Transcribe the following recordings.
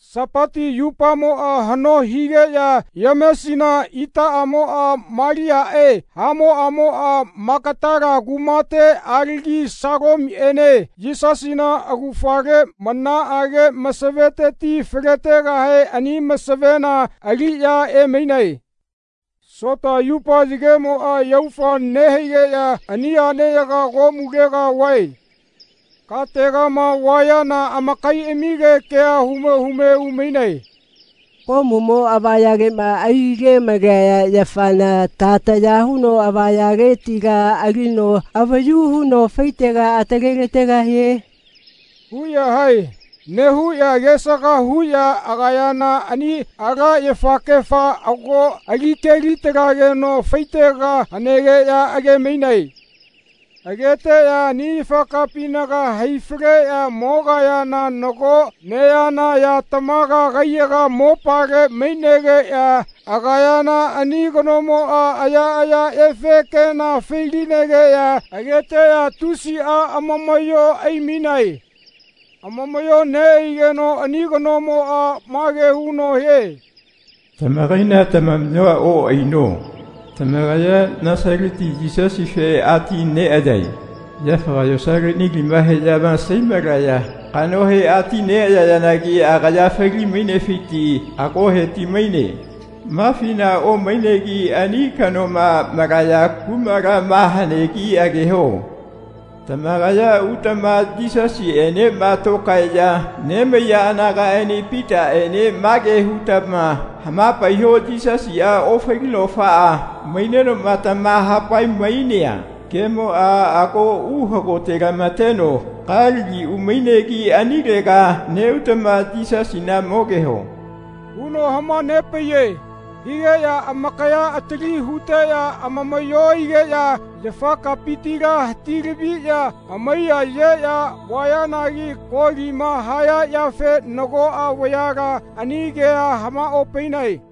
Sapati yupamoꞌa haꞌno higeꞌya Yemesina itaꞌamoꞌa Maliaꞌe hamoꞌamoꞌa Magatala kumate alagi Salomiꞌene Yisasina augafale manaꞌage masaveteti faletegahe ani masavena aliꞌya emainae. Sota yupa yagemoꞌa yaufa nehaigeꞌya ani aꞌneyaga komulega vae. Kategama vayana amakaiꞌamige kea hume hume umainae “Komumo avayaleꞌma aililemalea yafana ta taya huno avayaletila alino avayu huno faitega atalelategahie?” huꞌya hae. Nehuꞌya agesaga huꞌya agayana ani ala yafakefa ago alikelitalageno faitega hanegeꞌya agemainae. Ageteꞌya ani yafakapinaga hai faleꞌya mogayana nago neyana aya tamaga kaiyaga mopale mainegeꞌya agayana ani kanomoꞌa ayaꞌaya efe kena failinegeꞌya ageteꞌya tusiꞌa amamaꞌyo aimainae. Amamaꞌyo neꞌaigeno ani kanomoꞌa mage huno hie “Tamakaila tamamaꞌyoa oꞌaino. Tamakaya Nasaleti Yisasife ati neꞌayae. Yafaga yosale nilima heꞌya asaimalaya kanohe ati neꞌayayanagi agaya falimainefiti ago hetimaine. Mafina omainegi ani kanoma malaya kumala ma hanegi ageho. Tamakaya utama Yisasiꞌenema tokaeꞌya nemaiya anagaꞌene Pitaꞌene mage hutama hamapaiho “Yisasiꞌa ofalino afaꞌa mainenoꞌma tamahapaimainea kemoꞌa ago uhagotelamateno Kalili umainegi anilega neꞌutama Yisasina mogeho.” huno hamanepaiye. Higeꞌya amakaya atili huteꞌya amamaꞌyo aigeꞌya yafakapitila hatilaviꞌya amaiyayeꞌya vayanagi kolima haya yafe nagoꞌa vayala ani kea hamaopainae.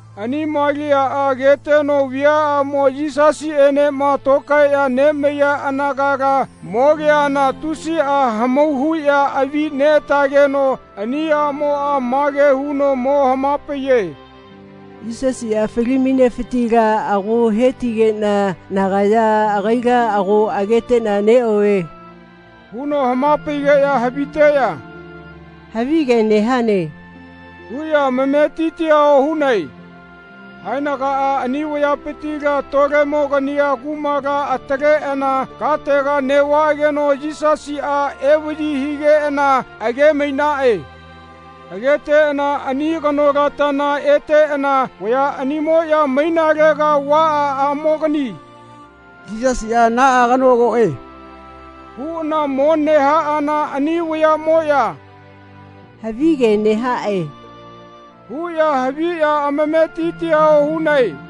Ani Maliaꞌa ageteno viaꞌamo Yisasiꞌenema tokaeꞌya nemaiya anagala mogeana tusiꞌa hamau huꞌya avineꞌatageno ani aꞌmoꞌa mage huno mo hamapaiye “Yisasiꞌa falimainefitila ago hetigeꞌna nagaya agaila ago ageteꞌna neꞌoe.” huno hamapaigeꞌya haviteꞌya “Havige nehane.” huꞌya amametitia ohunae. Haenagaꞌa ani vayapitila tolemogania kumala ataleꞌana katega neꞌvaꞌageno Yisasiꞌa evaꞌyi higeꞌana agemainaꞌe. Ageteꞌana ani kanolatana eteꞌana vayaꞌanimoꞌya mainalega vaꞌaꞌamogani “Yisasiꞌa naꞌa kano agoꞌe.” huꞌana mo nehaꞌana ani vayaꞌmoꞌya “Havige nehaꞌe.” huꞌya haviꞌya amametitia ohunae.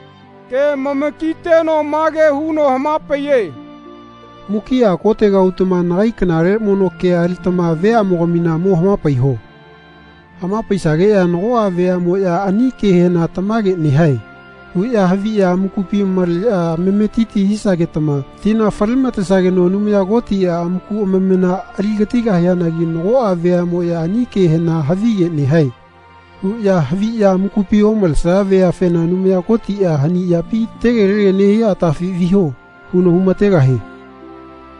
Kemamakiteno mage huno hamapaiye “Mukiꞌa kotega utama nagai kanale mono kea alitama veaꞌmogamina mo hamapaiho. Hamapaisageꞌya nagoꞌa veaꞌmoꞌya ani kehena ‘Tamage nehae.’ huꞌya haviꞌya amakupi maleꞌya amametiti hisagetama tina falematesageno Anumaya Kotiꞌa amaku amamena aligatigahianagi nagoꞌa veaꞌmoꞌya ani kehena ‘Havige nehae.’ huꞌya haviꞌya amakupi omalesaya veafena Anumaya Kotiꞌa ‘Hani yapi tegelege nehia atafi viho.’ huno humategahie.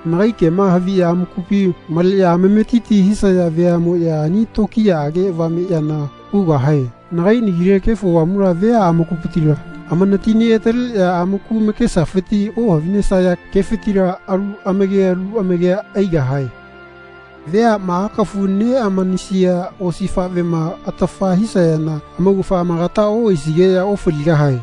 Nagai kema haviꞌya amakupi maleꞌya ametiti hisaya veaꞌmoꞌya ani tokiyaꞌage avame yana hugahae nagai nagile Kefo Avamula vea amakupitila amanati neꞌataleꞌya amaku amakesafiti ohavinesaya kefitila alu amake alu amakea aigahae. Veaꞌma akafu neꞌamanisia osifaꞌvema atafa hisayana amaugafa amagata oꞌaisigeꞌya ofaligahae.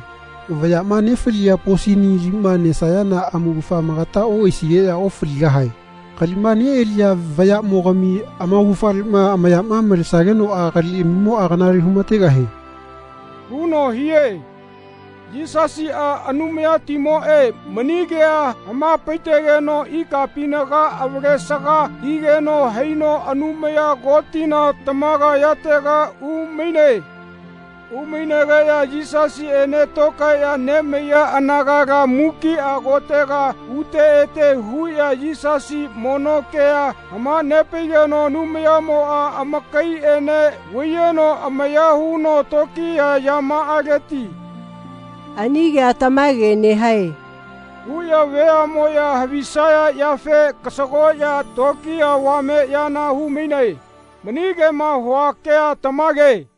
Vayaꞌma nefalia posini lima nesayana amaugafa amagata oꞌaisigeꞌya ofaligahae. Kalima neꞌaliya vayaꞌmogami amaugafaleꞌma amayama malesagenoꞌa kaliꞌamimoꞌa kanale humategahie.” huno hie. Yisasiꞌa, Anumayatimoꞌe mani kea hamapaitegeno ikapinaga avalesaga higeno haino Anumaya Kotina tamaga ayatega umaine. Umainegeꞌya Yisasiꞌene tokaeꞌya nemaiya anagala mukiꞌa kotega ute ete huꞌya Yisasi mono kea hamanepaigeno Anumayamoꞌa amakaiꞌene vaiyeno amaya huno tokiya yamaꞌaleti “Ani kea tamage nehae.” huꞌya veaꞌmoꞌya havisaya yafe kasagoꞌya tokiya avame yana humainae. Mani kema hua kea tamage.